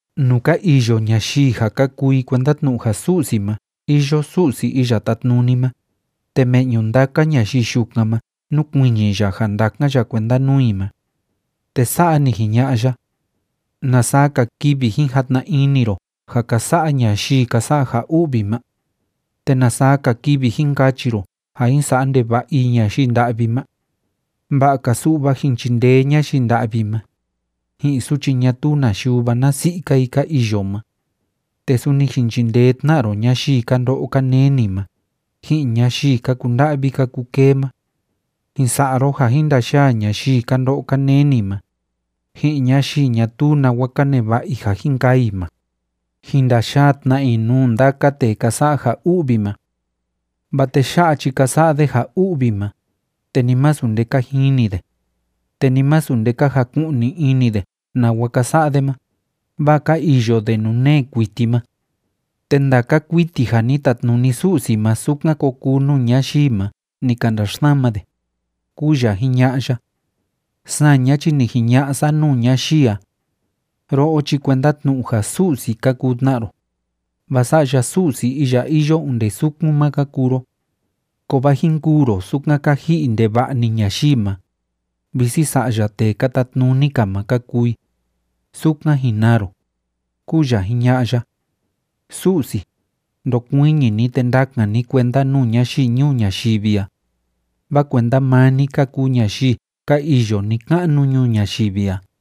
Nuu ka iyo ñayii ja ka kuu i kuenda tnu'u ja Su'si ma iyo Su'si Iya Tátnuni ma, te me'ñu ndaka ñayii yukan ma núkuiñi ya ja ndákan ya kuenda nuu i ma. Te sa'a ni jiña'a ya: “¿Na saa‑ka kivi jin jatna ini ro ja ka sa'a ñayii ka sa'a ja u'vi ma? ¿Te na saa‑ka kivi jin kachi ro ja jin sa'a ndeva'a i ñayii nda'vi ma? Va'a‑ka su'va jin chindee ñayii nda'vi ma, ji'in suchi ñatuu na yuva na si'i‑ka i ka iyo ma. Te suni jin chindee tna ro ñayii ka ndo'o ka neni ma, ji'in ñayii ka kunda'vi ka kukee ma. Jin sa'a ro ja jin ndayaa ñayii ka ndo'o ka neni ma, ji'in ñayii ñatuu nawa ka neva'a i ja jin kaa i ma, jin ndayaa tna i nuu nda'a tee ka sa'a ja u'vi ma. ’Vaa tee ya'a chi ka sa'a de ja u'vi ma, te ni masu nde ka jini de, te ni masu nde ka jaku'ni ini de nawa ka sa'a de ma, vaa ka iyo de nuu nee kuiti ma. Te ndaka kuiti ja ni tatnuni Su'si ma sukan ko kuu nuu ñayii ma ni ka ndaxsama de”, kúu ya jiña'a ya. Saña chi ni jiña'a sa nuu ñayii a: “Ro'o chi kuenda tnu'u ja su'si ka kuu tna ro, vaa sa'ya Su'si iya iyo onde sukun ma ka kuu ro. Kovaa jin kûu ro sukan ka ji'i ndeva'a‑ni ñayii ma, visi sa'ya tee ka tatnuni‑ka ma ka kuu i, sukan jin naa ro”, kúu ya jiña'a ya. Su'si, ndokuiñi ni, te ndakan ni kuenda nuu ñayii ñuu ñayivi a, vaa kuenda maa ni ka kuu ñayii ka iyo ni‑ka'nu ñuu ñayivi a.